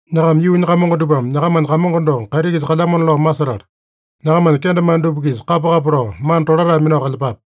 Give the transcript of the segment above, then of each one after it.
Nyakama yuunya kamongo dupame nyakamanya Kamongo doko kaiti-kisa kalyamona lao masetala, nyakamanya kendemane dupa-kisa kapa-kapa lao, mana tolatae minao kalyepape.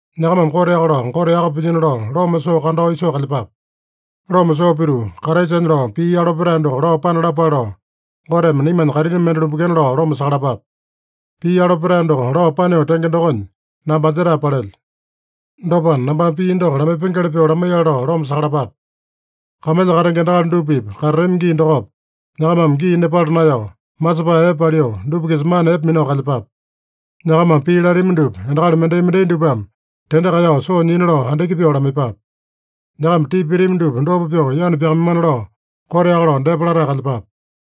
Nyakamame koteaka lao Gote yaka pilyino lao loma soo kandao isoo kalyepape. Loma soo pituu, Kraisanya lao pii yalo petae doko lao panalapale lao, Goteme naimanya kaitini mende lumbekena lao loma sakalapape. Pii yalo petae doko lao paneo tenge dokonya, namba anjetae palelyo. Dopana, nambame pii doko lamaipengeli pyoo lamaiyale lao loma sakalapape. Kamalya katenge endakali dupa-pipa katatami gii dokopa, nyakamame gii nepala naeyao, masepae epe paliu, dupa-kisa mana epe minao kalyepape. Nyakamame pii latami dupa endakali mendai-mendai dupame tende kaeyao soo nyina lao andiki pyoo lamaiyepape. Nyakama tipa pitami dupa dopa pyoo yanu pyakamaimana lao koteaka lao depa latae kalyepape.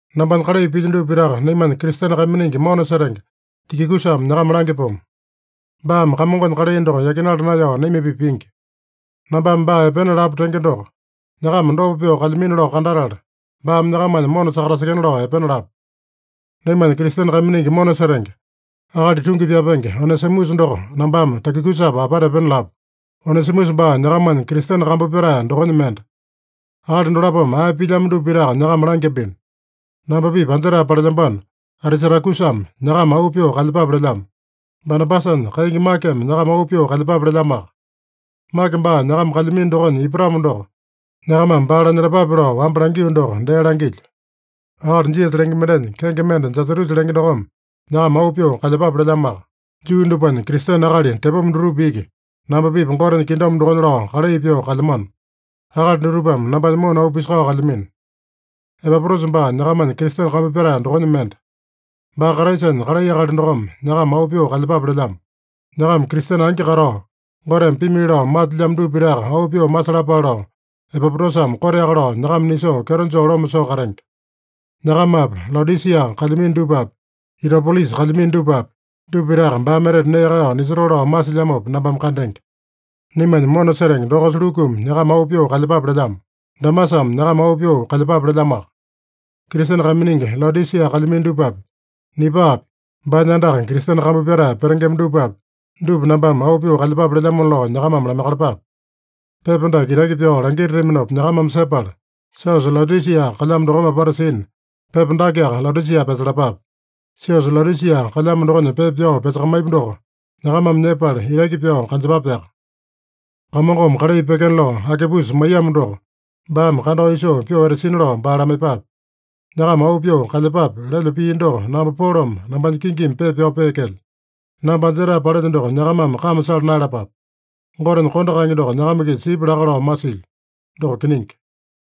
Nambanya kalai pilyo dupa pitaka naimanya Kristene kaiminingi mona setenge Tikikusame nyakama langyapomo. Baame Kamongonya kalai doko yakinala naeyao naima-pipa pingi. Nambame baa epena lapu tenge doko, nyakama dopa pyoo kalyamino lao kandatala, baame nyakamanya mona sakatasekena lao epena lapu. Naimanya Kristene kaiminingi mona setenge, akali tungi pyapenge Onesimusa doko nambame Tikikusapa apata epena lapu. Onesimusa baa nyakamanya Kristene kambu pyatae dokonya mende. Akali dolapome ae pilyamo dupa pitaka nyakama langyambino. Namba-pipa anjetae palelyambano Atisatakusame nyakama auu pyoo kalyepape lelyamo. Banabasanya kaingi Makeme nyakama auu pyoo kalyepape lelyamoaka. (Make baa nyakama kalyamino dokonya ipatamo doko, nyakamame baa lanyalapape lao wamba langio doko dee langilyo.) Akali Jisasa lenge mendenya, kenge mende Jasatusa lenge dokome nyakama auu pyoo kalyepape lelyamoaka. Juu dupanya Kristene akali tepoma dutupa iki namba-pipa Gotenya kingdom dokonya lao kalai pyoo kalyamano. Akali dutupame nambanya mona auu pisakao kalyamino. Epapotasa baa nyakamanya Kristene kambu pyatae dokonya mende. Baa Kraisanya kalai akali dokome nyakama auu pyoo kalyepape lelyamo. Nyakama Kristene angi katao, Goteme pimili lao masilyamo dupa pitaka auu pyoo masalapale lao, Epapotasame koteaka lao nyakama nisoo kyeto joo loma soo katenge. Nyakamapi, Laodisia kalyamino dupapi, Itapolisa kalyamino dupapi, dupa pitaka baame etete nee kaeyao nisotoo lao masilyamopa nambame kandenge. Naimanya mona setenge dokosa Lukumi nyakama auu pyoo kalyepape lelyamo. Demasame nyakama auu pyoo kalyepape lelyamoaka. Kristene kaiminingi Laodisia kalyamino dupapi, Nipaapi, baanya andaka Kristene kambu pyatae petengema dupapi, dupa nambame auu pyoo kalyepape lelyamona lao nyakamame lamaiyakalapape. Pepa dake itaki pyao langitataminopa nyakamame sepala, siosa Laodisia kalyamo dokome apata sina, pepa dakeaka Laodisia pyasalapape. Siosa Laodisia kalyamo dokonya pepa pyao pyasakamaipu doko nyakamame nyepala, itaki pyao kanjepapeaka. Kamongome kalai pyekena lao Akipusa maiyamo doko baame kandao isoo pyoo etasina lao baa lamaiyepape. “Nyakama auu pyoo kalyepape” lelyo pii doko namba Polome nambanya kingimi pepa pyao peekelyo. Namba anjetae palelyo doko nyakamame kame sala naeyalapape. Gotenya kondo kaenge doko nyakama-kisa sipya laka lao masilyo. Doko kiningi.